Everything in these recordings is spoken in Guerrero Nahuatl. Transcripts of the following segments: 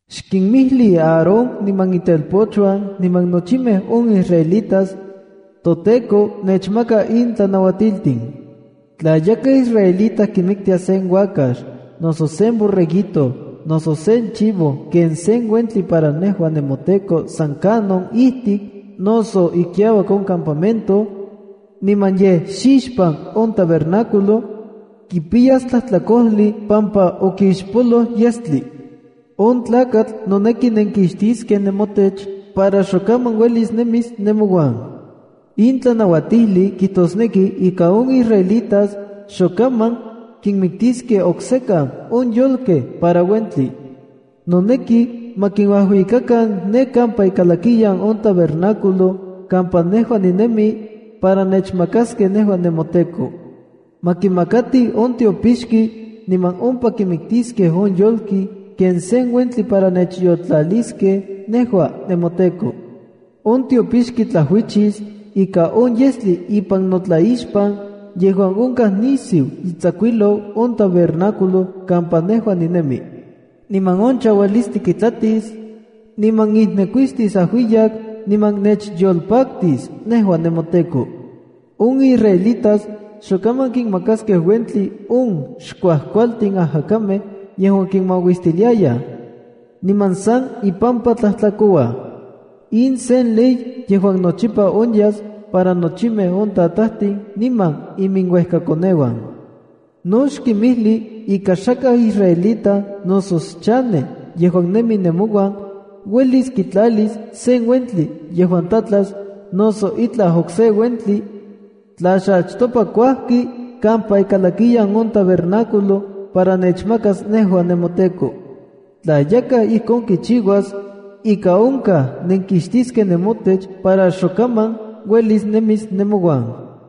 “Xkinmijli Aarón niman itelpochuan niman nochimej on israelitas: ‘ToTEKO mechmaka in tlanauatiltin. ’Tla yakaj israelita kimiktia sen uakax noso, sen borreguito, noso sen chivo ken sen uentli para nejua nemoTEKO san kanon ijtik noso ikiauak on campamento, niman yej xixpan on tabernáculo, kipiyas tlajtlakojli pampa okixpoloj yestli. On tlakatl noneki nenkixtiskej nemotech para xokaman uelis nemis nemouan. In tlanauatijli kijtosneki ika on israelitas xokaman kinmiktiskej oksekan on yolkej para uentli. Noneki ma kinuajuikakan ne kampa ikalakiyan on tabernáculo kampa nejua ninemi, para nechmakaskej nejua nemoTEKO. Ma kimakatij on tiopixki niman ompa kimiktiskej on yolki ken sen uentli para nechyoltlaliskej nejua, nemoTEKO. On tiopixki tlajuichis ika on yestli ipan notlaixpan yejuan onkaj nisiu itsakuijlou on tabernáculo kampa nejua ninemi. Niman on chaualistli kitlatis, niman ijnekuistis ajuiyak, niman nechyolpaktis nejua nemoTEKO. On israelitas xokaman kinmakaskej uentli on xkuajkualtin ajakamej yejuan kinmauistiliayaj, niman san impampa nijtlakouaj. In sen ley yejuan nochipa onyas para nochimej on tatajtin niman iminuejkakoneuan. ’No xkinmijli ika xakaj israelita noso xchanej yejuan nemi nemouan, uelis kitlalis sen uentli yejuan tlatlas noso itlaj okse uentli, tla xachtopa kuajki kampa ikalakiyan on tabernáculo para nechmakas nejua nemoTEKO. Tla yakaj ijkon kichiuas, ika onkaj nenkixtiskej nemotech para xokaman uelis nemis nemouan.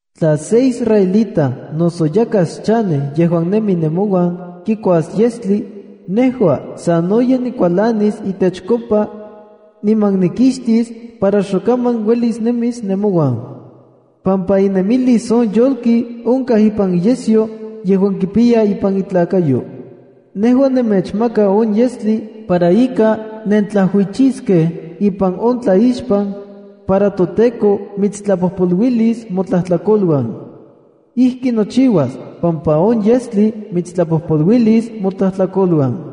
’Tla se israelita noso yakaj xchanej yejuan nemi nemouan kikuas yestli, nejua sanoyej nikualanis itechkopa, niman nikixtis para xokaman uelis nemis nemouan, pampa inemilis on yolki onka ipan iyesyo yejuan kipiya ipan itlakayo. Nejua nemechmaka on yestli para ika nentlajuichiskej ipan on tlaixpan, para toTEKO mitstlapojpoluilis motlajtlakoluan. Ijki nochiuas pampa on yestli mitstlapojpolu-lis motlajtlakoluan.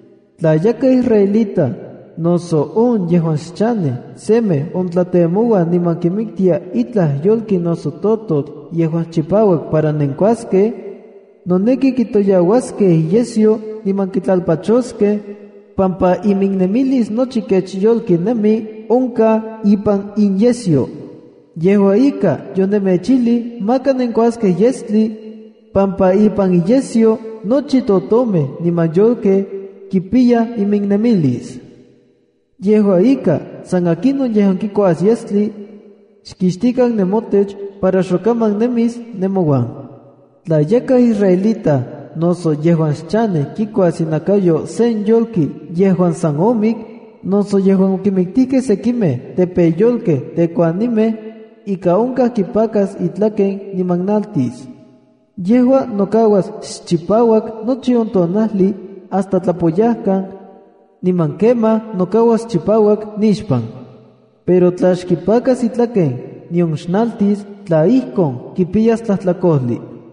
Tla yakaj israelita noso on yejuan xchanej semej ontlatemoua niman kimiktia itlaj yolki noso tototl yejuan chipauak para nenkuaskej, noneki kitoyauaskej iyesyo niman kitlalpachoskej, pampa iminnemilis nochi kech yolki nemi onkaj ipan inyesyo. Yejua ika, yonemechijli maka nenkuaskej yestli, pampa ipan inyesyo nochi totomej niman yolkej kipiyaj iminnemilis. Yejua ika, san akinon yejuan kikuas yestli, xkixtikan nemotech para xokaman nemis nemouan. ’Tla yakaj israelita noso yejuan xchanej kikuas inakayo sen yolki yejuan san omik, noso yejuan okimiktijkej sekimej tepeyolkej tekuanimej, ika onkaj kipakas itlaken niman naltis. Yejua nokauas xchipauak nochi on tonajli hasta tlapoyajkan, niman kemaj nokauas chipauak nixpan. Pero tla xkipakas itlaken, nion xnaltis, tla ijkon, kipiyas tlajtlakojli.”